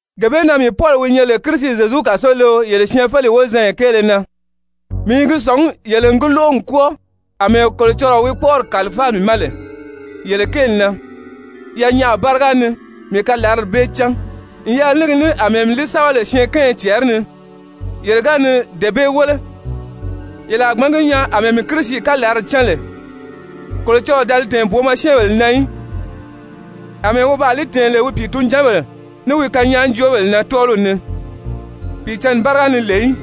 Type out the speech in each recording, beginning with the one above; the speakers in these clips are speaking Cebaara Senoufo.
Gee bee na mii Pɔli wi nyɛ lè Kirisi Zyezu kàsoleo yele syɛɛnfeleyi wozanya kéele na, mii i gi sɔ̀ngí yele n gi lóʔo n kwɔ́ɔ àmɛɛ Kolocɔlɔɔ wi kpɔ́ʔɔri kàlifáa mii ma lè yele kéeli na. Yanyaʔa báriga ni mii kalarali bee cán n yɛlɛ ní gi ní àmɛɛ mii li sɛ́bɛ lè syɛɛnkanya cɛɛri ni. Yele ga ni dee bee wéle yele a gbǎn gi nyaa àmɛɛ mii Kirisi kalarali cán lè. Kolocɔlɔɔ da li tɛ̀ɛn booma syɛ́ɛnbèle na í, àmɛɛ wi baa li tɛ̀ɛn lè wi pìitunjanbèle, ní wi kanyaajoobèle na tɔ́ɔliw ni Pìicǎnni báriga ni lè í,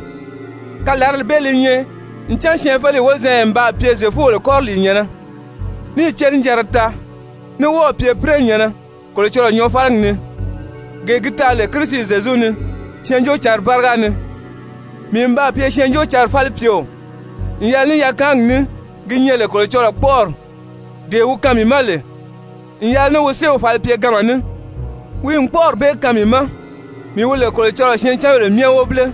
kalarali bee li nyɛ ncan syɛɛnfeleyi wozanya n baa pye Zyefubèle kɔriliinyɛ̀nnɛ, níì cenijanra taa, ní wɔ́ɔ̀ pye be pínɛnyɛ̀nnɛ Kolocɔlɔɔ nyɔɔfaligi ni, gee gi taa lè Kirisi Zyezu ni Syɛɛnjóocǎnri báriga ni. Mii n baa pye Syɛɛnjóocǎnri falipyeo n yɛlɛ ní yakaangi ní ki nyɛ lè Kolocɔlɔɔ kpɔ́ʔɔri, dee wi kaan mii ma lè n yɛlɛ ní wi séew falipyeganma ní. Wi n kpɔ́ʔɔri bee kaan mii ma, mii wi lè Kolocɔlɔɔ syɛɛncanbèle myɛ wobile,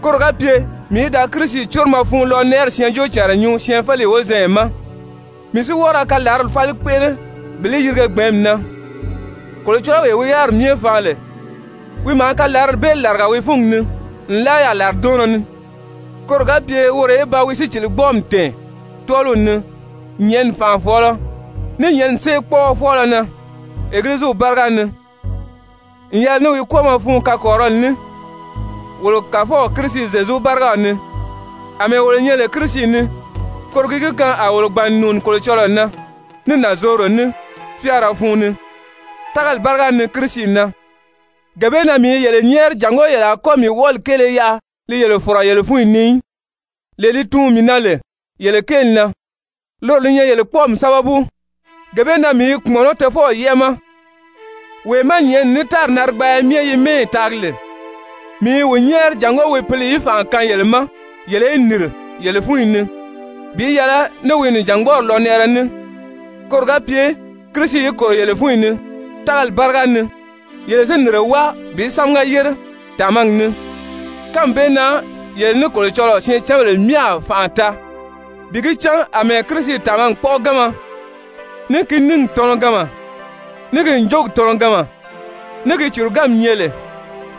koro ga pye mii í da Kirisi córomɔ fun lɔnɛʔɛri syɛɛnjóocànra nyuu syɛɛnfeleyi wozanya ma, mii si wɔ́ɔ ra kalarali fáli kpéʔele bi li yirige gbɛ̀ɛ́nmi na, Kolocɔlɔwee wi yáriri myɛ faan lè, wi maa kalarali bee làriga wi fúngi ni nlaa yaà làridɔɔnnɔ ni, koro ga pye woro í ba wi síciligbɔɔmi tɛ̀ɛn tɔ́ɔliw ni nyɛ̀ʔɛni fànʔafɔɔlɔ, ní nyɛ̀ʔɛni séekpɔɔɔ fɔɔlɔ na Egiliziw báriga ni, n yɛlɛ ní wi kwɔ́ɔmɔ fun kakɔrirɔli ní, wolo Kàfɔw Kirisi Zyezu bárigaw ni. Amɛɛ wolo nyɛ lè Kirisi ni, koro gi gi kaan a wolo gbàn n nùuni Kolocɔlɔɔ na ní nànzorodo ní, fyáara fun ni, tágali báriga ni Kirisi na. Gee bee na mii i yele nyɛ́ɛri jàngó yele a kɔ́ mii wɔʔɔli kéele yaʔa li yele fɔ̀rɔ yele fúnyi ni í, lee li tuun mii na lè yele kéeli na. Loro li nyɛ yele kpɔ́ɔmi sábabu. Gee bee na mii i kpùmɔnɔ́ Tofɔw yɛ́ʔɛ ma, wee má nyɛ̀ʔɛni ní tári narigbaaya myɛ yi mɛ́ɛyi taagi lè. Mii i wi nyɛ́ɛri jàngó wi Pǐli í fànʔa kaan yele ma yele í nìri yele fúnyi ni bi yɛlɛ ní wi nìjangbɔɔri lɔnɛʔɛrɛ ní, koro ga pye Kirisi í kòro yele fúnyi ni tágali báriga ni, yele si nìnre wáa bi sámaga yére tàmagi ni. Kánmi bee na yele ní Kolocɔlɔɔ syɛɛncanbèle myɛ a fànʔa taa bi gi cán àmɛɛ Kirisi tàmagi kpɔ́ʔɔganma, ní ki níngi tɔnɔganma, ní ki ǹjogi tɔnɔganma, ní ki cùruganmi nyɛ lè,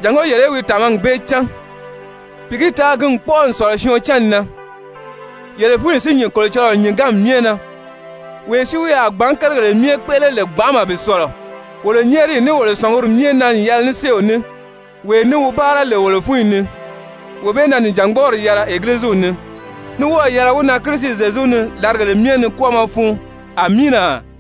jàngó yele í wi tàmagi bee cán bi gi taa ki n kpɔ́ʔɔ n sɔ̀lɔ syɔɔn cánni na, yele fúnyi si nyìn Kolocɔlɔɔ nyìnganmi myɛ na. Wee si wi a gbǎn kérigèle myɛ kpéʔele lè gbanʔama bi sɔ̀lɔ wolo nyɛ́ɛriyi ní wolo sɔ̀nguri myɛ na n yɛlɛ ní séew ní, wee ní wi báara lè wolo fúnyi ni, wee bee na nìjangbɔɔri yɛlɛ Egiliziw ni, ní wɔ́ɔ̀ yɛlɛ wi na Kirisi Zyezu ni làrigèle myɛ ni kwɔ́ɔmɔ fun. Amiina.